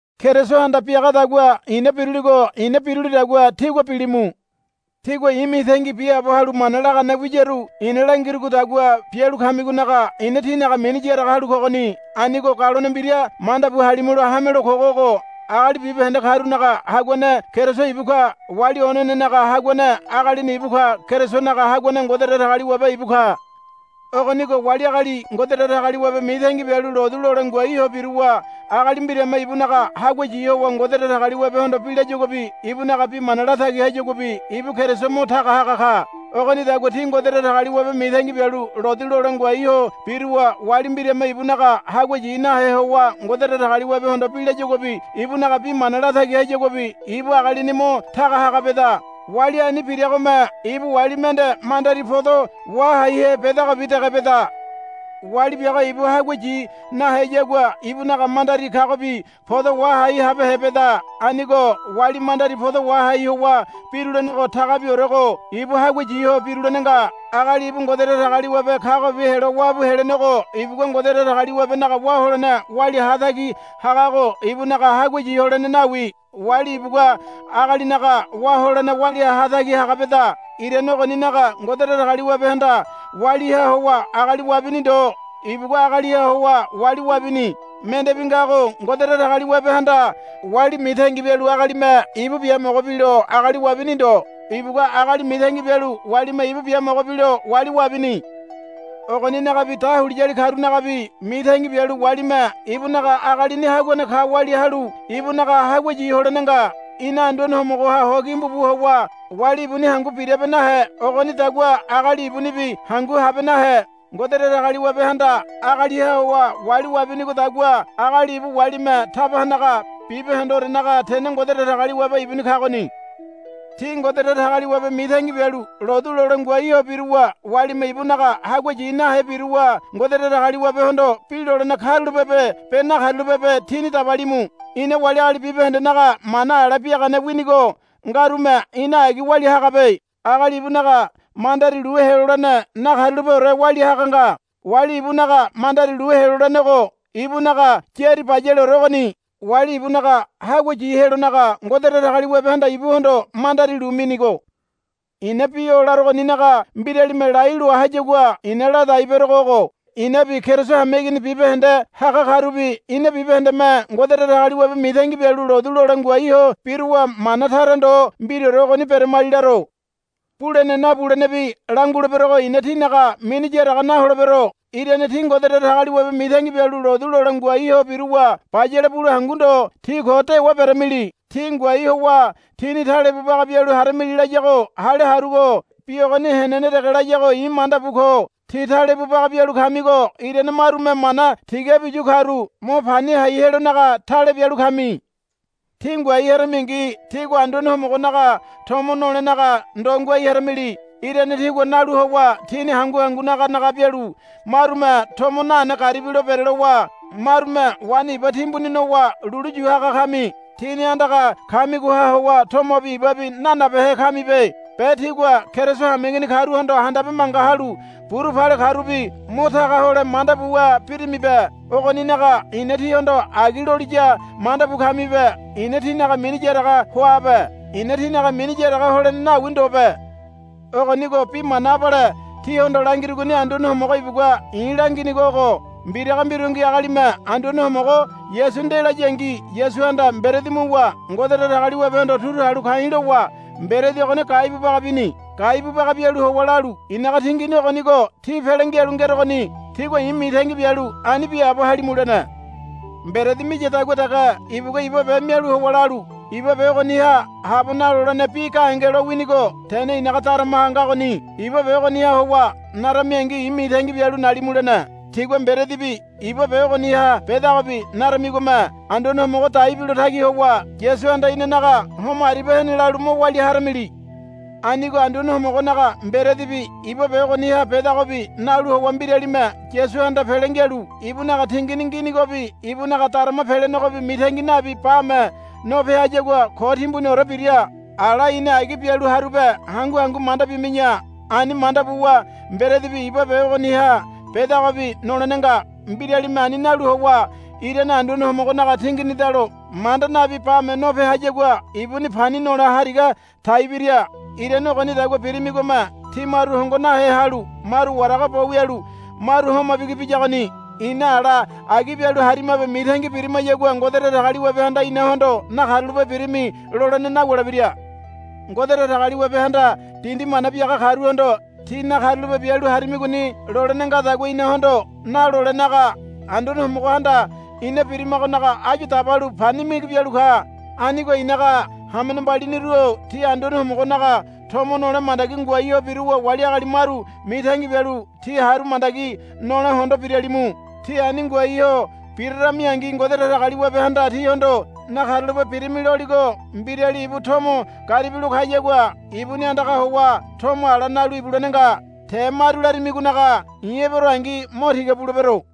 Kerisohanda biagadagua i̱na biruligo i̱na birulidagua tígua bilimu. Tígua i̱ mitangi biaabo halu mana lagane wiyaru i̱na langirugodagua bialu kamigonaga i̱na tínaga mini yaraga halu kogoni. Anigo galone mbira manda bu halimulo hamelo kogo ogo. Agali bibahende karunaga haguane Keriso ibu ka. Wali onenenaga haguane agalini ibu ka. Kerisonaga haguane Ngode Datagaliwabe ibu ka. Ogonigo wali agali Ngode Datagaliwabe mitangi bialu lotu lole ngoai ho biruwa agali mbirame ibunaga hagua yi howa Ngode Datagaliwabehondo bi layaguabi ibunaga bi mana latagi hayaguabi ibu Keriso mo taga haga ka. Ogonidagua tí Ngode Datagaliwabe mitangi bialu lotu lole ngoai ho biruwa wali mbirame ibunaga hagua yi nahe howa Ngode Datagaliwabehondo bi layaguabi ibunaga bi mana latagi hayaguabi ibu agalini mo taga haga beda. Wali ani biragome ibu wali mende mandari podo wahaihe bedagobi dege beda. Wali biago ibu hagua yi naheyagua ibunaga mandari kagobi podo wahai habehe beda. Anigo wali mandari podo wahai howa birulenego tagabiorego ibu hagua yi ho birulene nga. Agali ibu Ngode Datagaliwabe kagobi helo wabu helenego ibugua Ngode Datagaliwabenaga wá holene walia hatagi hagago ibunaga hagua yi holene nawi. Wali ibugua agalinaga wá holene walia hatagi haga beda. Irane ogoninaga Ngode Datagaliwabehanda waliha howa agali wabini ndo. Ibugua agaliha howa wali wabini. Mendebi ngago Ngode Datagaliwabehanda wali mitangi bialu agalime ibu biamogo bilo agali wabini ndo. Ibugua agali mitangi bialu walime ibu biamogo bilo wali wabini. Ogoninagabi dahuliyali karunagabi mitangi bialu walime ibunaga agalini haguane ka walia halu ibunaga hagua yi holene nga. Ina Anduane Homogoha ho gimbu bu howa wali ibuni hangu birabe nahe ogonidagua agali ibunibi hangu habe nahe. Ngode Datagaliwabehanda agaliha howa wali wabinigodagua agali ibu walime taba hanaga. Bibahendeorenaga tene Ngode Datagaliwabe ibuni kagoni. Tí Ngode Datagaliwabe mitangi bialu lotu lole ngoai ho biruwa walime ibunaga hagua yi nahe biruwa Ngode Datagaliwabehondo bi lolene karulape be nakarulapebe tíni dabalimu. Ina wali agali bibahendenaga mana ala biagane winigo ngarume ina agi walia hagabe. Agali ibunaga mandari lu helolene nakarulapeore walia haga nga. Wali ibunaga mandari lu helolenego ibunaga yári bayaleore ogoni. Wali ibunaga hagua yi helonaga Ngode Datagaliwabehanda ibuhondo mandari lu minigo. I̱na bi o larogoninaga mbiralime lai loa hayagua i̱na ladai berogo ogo. Inabi Keriso hameigini bibahende haga karubi ina bibahendeme Ngode Datagaliwabe mitangi bialu lotu lole ngoai ho biruwa mana tara ndo mbiraore ogoni beramali laro. Bulene nabulenebi languleberogo i̱na tínaga mini yaraga naholebero. Irane tí Ngode Datagaliwabe mitangi bialu lotu lole ngoai ho biruwa bayale bule hangu ndo tí ko dewa beremili. Tí ngoai howa tíni talebu baga bialu haramili layago hale harugo bi ogoni henene dege layago i̱ manda bu ko. Tí talebu baga bialu kamigo irane marume mana tigabi yu karu mo pani hai helonaga tale bialu kami. Tí ngoai haramingi tígua Anduane Homogonaga tomo nolenaga ndo ngoai haramili. Irane tígua nalu howa tíni hangu hangu naga naga bialu marume tomo nane garibilo berelowa marume waini iba timbuni nowa lulu yu haga kami. Tíni andaga kamigoha howa tomobi ibabi nanabehe kamibe. Be tígua Keriso hameigini karuhondo handabe manga halu buru pale karubi mo taga hole manda buwa birimibe. Ogoninaga i̱na tíhondo agi loliya manda bu kamibe. I̱na tínaga mini yaraga hoabe. I̱na tínaga mini yaraga holene nawi ndobe. Ogonigo bi mana abale tíhondo langirugoni Anduane Homogo ibugua i̱ langinigo ogo. Mbiraga mbirungi agalime Anduane Homogo Yasu nde layangi Yasuhanda mberedi muwa Ngode Datagaliwabehondo turu halu ka̱i̱ lowa mberedi ogoni gaibu baga bini. Gaibu baga bialu howa lalu, I̱naga tingini ogonigo tí pele ngialu ngerogoni. Tígua i̱ mitangi bialu ani biaabo halimu, lene. Mberedi miyadagua dege ibugua iba be mialu howa lalu, Iba be ogoniha habo nalolene bi gahenge lo winigo tene i̱naga daramaha ngagoni. Iba be ogoniha howa naramingi i̱ mitangi bialu nalimu, lene. Tígua mberedibi iba be ogoniha bedagobi naramigome Anduane Homogo dai bilo tagi howa Yasuhanda inanaga homo aribia hene lalu mo walia haramili. Anigo Anduane Homogonaga mberedibi iba be ogoniha bedagobi nalu howa mbiralime Yasuhanda pele ngialu ibunaga tingini nginigobe ibunaga darama pelenegobi mitangi nabi bame nope hayagua ko timbuniore bira. Ala i̱ni agi bialu harube hangu hangu manda bimi̱ya. Ani manda buwa mberedibi iba be ogoniha bedagobi nolene nga. Mbiralime ani nalu howa irane Anduane Homogonaga tinginidalo manda nabi bame nope hayagua ibuni pani nole hariga tai bira. Irane ogonidagua birimigome tí maru hongo nahe halu maru warago bo wialu maru homa bigi biyagoni. Ina ala agi bialu harimabe mitangi birimayagua Ngode Datagaliwabehanda inahondo, Nakarulape birimi, lolene nawulebira. Ngode Datagaliwabehanda dindi mana biaga karuhondo, Tí nakarulape bialu harimigoni, lolene ngadagua inahondo nalolenaga Anduane Homogohanda ina birimagonaga áyu dabalu pani migi bialu ka. Anigo i̱naga hamene mbaliniru-o ti Anduane Homogonaga tomo nole mandagi ngoai ho biruwa wali agali maru mitangi bialu ti haru mandagi nole hondo biralimu. Tí ani ngoai ho biraramingi Ngode Datagaliwabehanda tíhondo, Nakarulape birimi, loligo mbirali ibu tomo garibilo kayagua ibuni andaga howa tomo ala nalu ibulene nga. Te maru larimigonaga i̱ eberongi mo tiga bulebero.